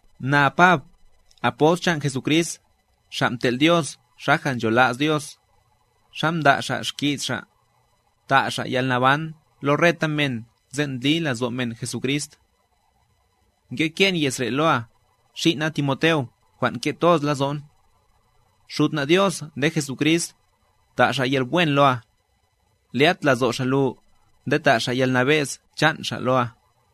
Na Pab, apost chan' Jesucrist, xa' mtel' Dios xaja' nchola's Dios', xa mda' Xa' xki's Xa', ta' Xa' yalnaban lo reta men sen' ndli lazo' men Jesucrist. Ngeke'n ye's re' loa, xin' na Timoteo jwan' nke' toz lazo'n. Xud na' Dios nde Jesucrist, ta' Xa' yalwen loa, lyat lazo' Xa' lu nde ta' Xa' yalnabe'z chan' Xa' loa.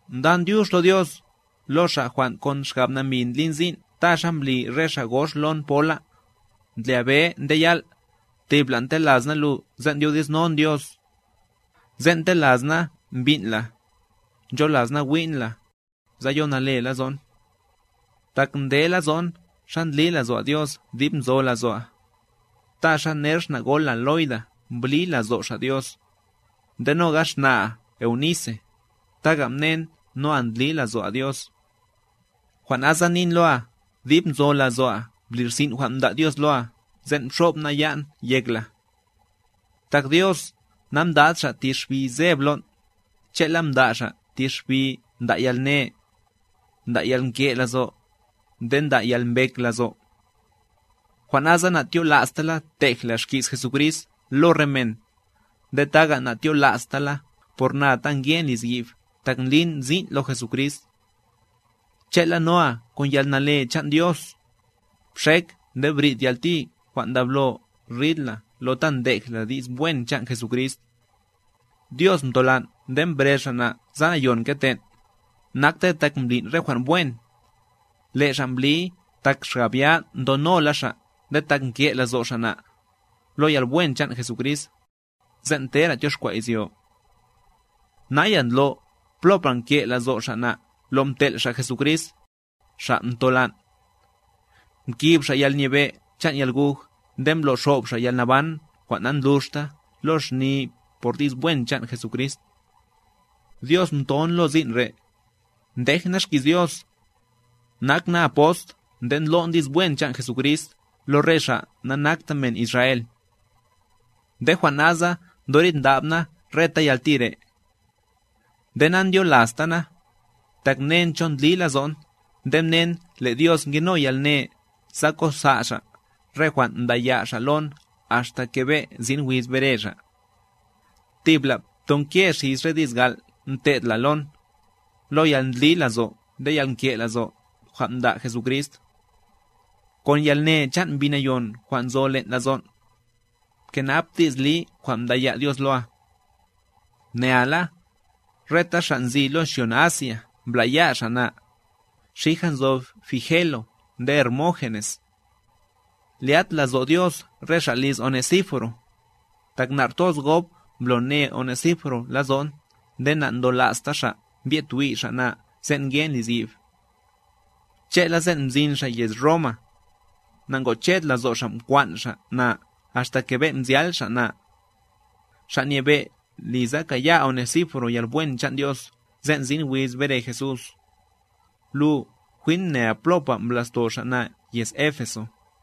Ndan dyux lo Dios, lo Xa' jwan' kon xgab nambi ndlin sin' ta xa mbli re xa' gox lon pola, ndlya be nde yal', thibla' ntelas na lu sen' ndyodi'snon Dios. Sen' ntelas na mbin' la, ncholas na wi'n la, sa yo nale lazo'n. Tak ndelazo'n xa ndli lazo'a Dios dib nzo lazo'a, ta xa ner xna' gol la Loida mbli lazo' xa' Dios, nde noga' xna'a Eunise, taga' mnen noa ndli lazo'a Dios. Jwan' nasa nin loa, dib nzo lazo'a bli rsi'n jwan' mda' Dios loa sen' mxo'b na ya'n yek la. Tak Dios namdad ti xbi seb lon', che'la mda' Xa' thi xbi nda' yalne, nda' yalnke' lazo', nde nda' yalmbek lazo'. Jwan' nasa natyola'sta la tej la xki's Jesucrist lo re men, nde taga' na'tyola'sta la por na ta ngen lizyi'b tak ndlin sin' lo Jesucrist. Che'la, noa kon yalne chan' Dios, bxek nde bri'd yalti jwan' ndablo rid la lo ta ndej la di's wen chan' Jesucrist. Dios mtolan' nde mbrez Xa' na' sa nayon kete'n, naktey tak mblin' re jwan' wen, le' Xa' mbliy tak xgab ya ndonola Xa' nde tak nke' lazo' Xa' na', lo yalwen chan' Jesucrist, sen' tera' tyoxkwa' izyo. Naya, ndlo' plopa' nke' lazo' Xa' na' lo mtel' Xa' Jesucrist, Xa' ntola'n. Mkib Xa' yalnyebe' chan' yalguj nde mblo'xob Xa' yalnaban jwan' nandluxta lo xni por di's wen chan' Jesucrist. Dios mton lo sin' re', ndej na xki's Dios, nak na apost nde ndlo'n di's wen chan' Jesucrist lo re xa' nanakta men Israel. Nde jwan' nasa ndoridndab na reta yalti re'. Nde nandyolasta na, tak mnen cho ndli lazo'n nde mnen le' Dios ngeno yalne sa kosa' Xa' re jwan' mdaya' Xa' lon axta kebe' sin wiz bere Xa'. Thibla btonke' xis re di's gal' mte'd la lon, lo yalndli lazo' nde yalnke' lazo' jwan' mda' Jesucrist. Kon yalne chan' Mbi Nayon jwan' nzo len' lazon', bkenap di's li jwan' mdaya' Dios loa. Mnea la, reta xa' nzi lo xyon Asia mbla'ya' xa' na, xija nzo Figelo nde Hermógenes. Lyat lazo' Dios re xa' liz Onesíforo, tak nar toz gob mblo ne Onesíforo lazo'n nde na'ndolasta xa' mbyed twi' xa' na sen' ngen lizyi'b. Che'la sen' mzin xa' yez Roma, nangoched lazo' xa' mkwan' xa' na axta kebe' mzyal xa' na. Xa' Nyebe' li sa kaya' Onesíforo yalwen chan' Dios sen' sin wiz bere Jesús. Lu jwin mnea plopa' mbla'sto xa' na' yez Éfeso.